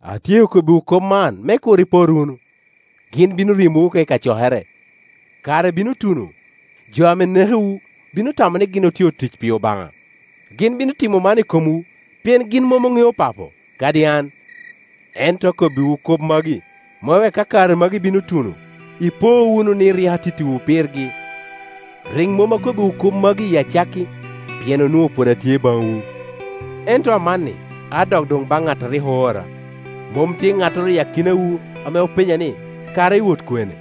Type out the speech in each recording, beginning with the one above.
“Atyeko kobbiwu kop man me kur ipot wunu. Gin bino ryemowu oko i kacokere; kare bino tuno, jo ame nekowu bino tamo ni gin otye otic pi Obaŋa. Gin bino timo man i komwu pien gin mom oŋeo Papo, kadi an. Ento akobbiwu kop magi, me wek ka kare magi bino tuno, ipo wunu ni rik atittiwu pirgi. Tic a Cuny Acil “Rik mom akobbiwu kop magi i acakki, pien onwoŋo pwod atye baŋwu. Ento amanni adok doŋ baŋ ŋat a rik oora. Mom tye ŋattoro i akinawu ame openya ni, ‘Kara iwot kwene?’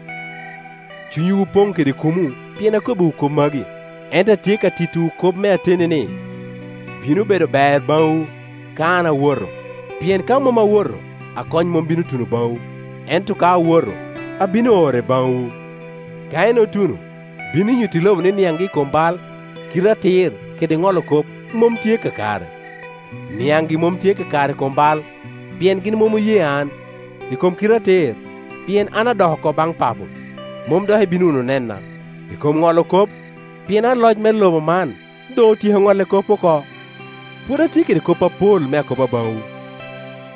Cunywu opoŋ kede kumo pien akobbiwu kop magi. Ento atye ka tittiwu kop me ateni, ni, bino bedo ber baŋwu ka an awoto; pien ka mom awoto, Akony mom bino tuno baŋwu, ento ka awoto, abino ore baŋwu. Ka en otuno, bino nyutti lobo ni niaŋgi i kom bai, kite atir kede ŋolo kop mom tye kakare: niaŋgi mom tye kakare i kom bai, pien gin mom oye an; i kom kite atir, pien an adok oko baŋ Papo, mom dok ibino wunu nena; i kom ŋolo kop, pien aloc me lobo man doŋ otyeko ŋolle kop oko. “Pwod atye kede kop apol me akoba baŋwu,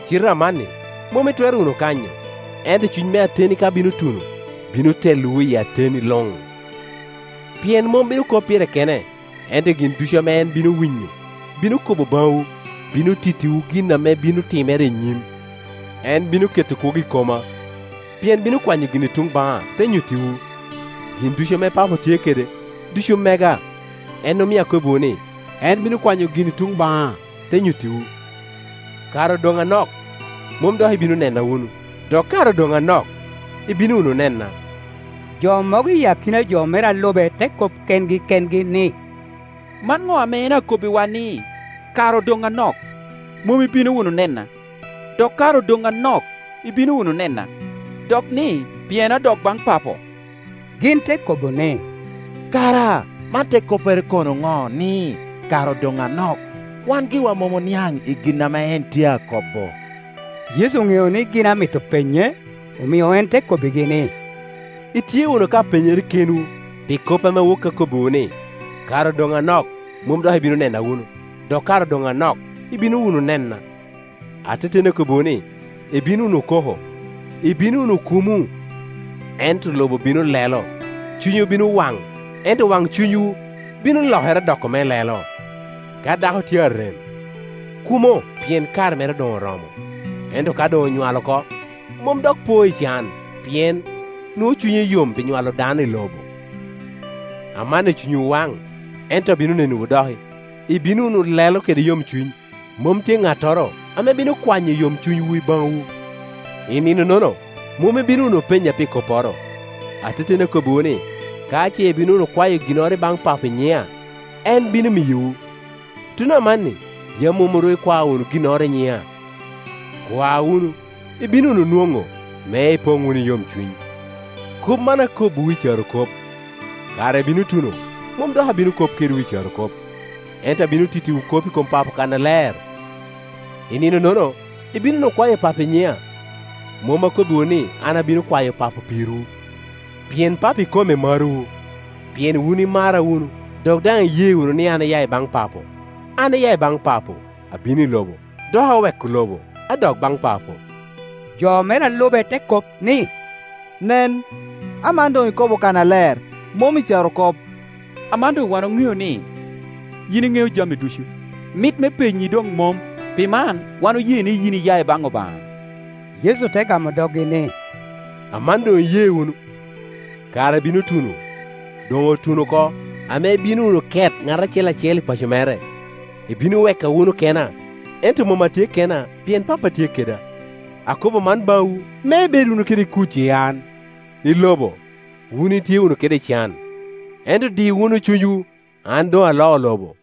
cite amanni mom itwero wunu kanyo; ento Cuny me ateni ka bino tuno, bino telowu i ateni luŋ; pien mom bino kop pire kene, ento gin ducu ame en bino winyo, bino kobo baŋwu, bino tittiwu gin ame bino timere i nyim. En bino keto kwogo i koma, pien bino kwanyo gin i tuŋ baŋa, te nyuttiwu. Gin ducu ame Papo tye kede, ducu mega; en omio akobbiwu ni, en bino kwanyo gin i tuŋ baŋa, te nyuttiwu. “Kare odoŋ anok, mon dok ibino nena wunu; dok kare odoŋ anok ibino wunu nena.” Jo mogo i akina jo mere a lube te kop kengi kengi ni, “Man ŋo ame en akobbiwa, ni, ‘Kare odoŋ anok, mom ibino wunu nena, dok kare odoŋ anok ibino wunu nena’; dok ni, ‘Pien adok baŋ Papo?’” Gin te kobo ni, “Kara man te koppere kono ŋo, ni, ‘Kare odoŋ anok?’ Wan giwa mom oniaŋ i gin ame en tye a ko bo.” Yecu oŋeo ni gin amito penye, omio en te kobbigi ni, “Itye wunu ka penyere kenwu pi kop ame woki akobbiwu ni, ‘Kare odoŋ anok, mom dok ibino nena wunu; dok kare odoŋ anok, ibino wunu nena?’ Ateteni akobbiwu ni, ibino wunu koko, ibino wunu kumo, ento lobo bino lelo; cunywu bino wan, ento wancunywu bino lokere doko me lelo. Ka dako tye a rem, kumo pien kare mere doŋ oromo; ento ka doŋ onywal oko, mom dok po i can, pien nwoŋo cunye yom pi nywalo dano i lobo. Amanni cunywu waŋ, ento abino nenowu doki, ibino wunu lelo kede yomcuny, mom tye ŋattoro ame bino kwanyo yomcuny wu i baŋwu. I nino-nono mom ibino wunu penya pi kopporo. Ateteni akobbiwu ni, ka ce ibino wunu kwayo ginnoro ibaŋ Papo i nyina, en bino miyowu. Tuno amanni yam mom ru ikwao wunu ginnoro i nyina; kwa wunu, ibino wunu nwoŋo, me ipoŋ wunu i yomcuny. “Kop man akobbiwu i carokop; kare bino tuno, mom dok abino kop kedwu i carokop, ento abino tittiwu kop i kom Papo kannaler. I nino-nono ibino wunu kwayo Papo i nyina; mom akobbiwu ni an abino kwayo Papo pirwu; pien Papo ikome marowu, pien wun imara wunu dok daŋ iye wunu ni an aya i baŋ Papo. An aya i baŋa Papo, abino i lobo; dok aweko lobo, adok baŋ Papo.” Jo me re a lube te kop ni, “Nen, aman doŋ ikobo kannaler, mom i carokop. Aman wan doŋ oŋeo ni yin iŋeo jami ducu, mit me penyi doŋ mom; pi man wan oye ni yin iya i baŋ Obaŋa.” Yecu te gamo doggi ni, “Aman doŋ iye wunu? Kare bino tuno, doŋ otuno oko, ame ibino wunu ket, ŋat acel acel i paco mere, ibino weka wunu kena. Ento mom atye kena, pien Pappa tye keda. Akobo man baŋwu me ibed wunu kede kuc i an, i lobo wun itye wunu kede can; ento di wunu cunywu, an doŋ aloo lobo.”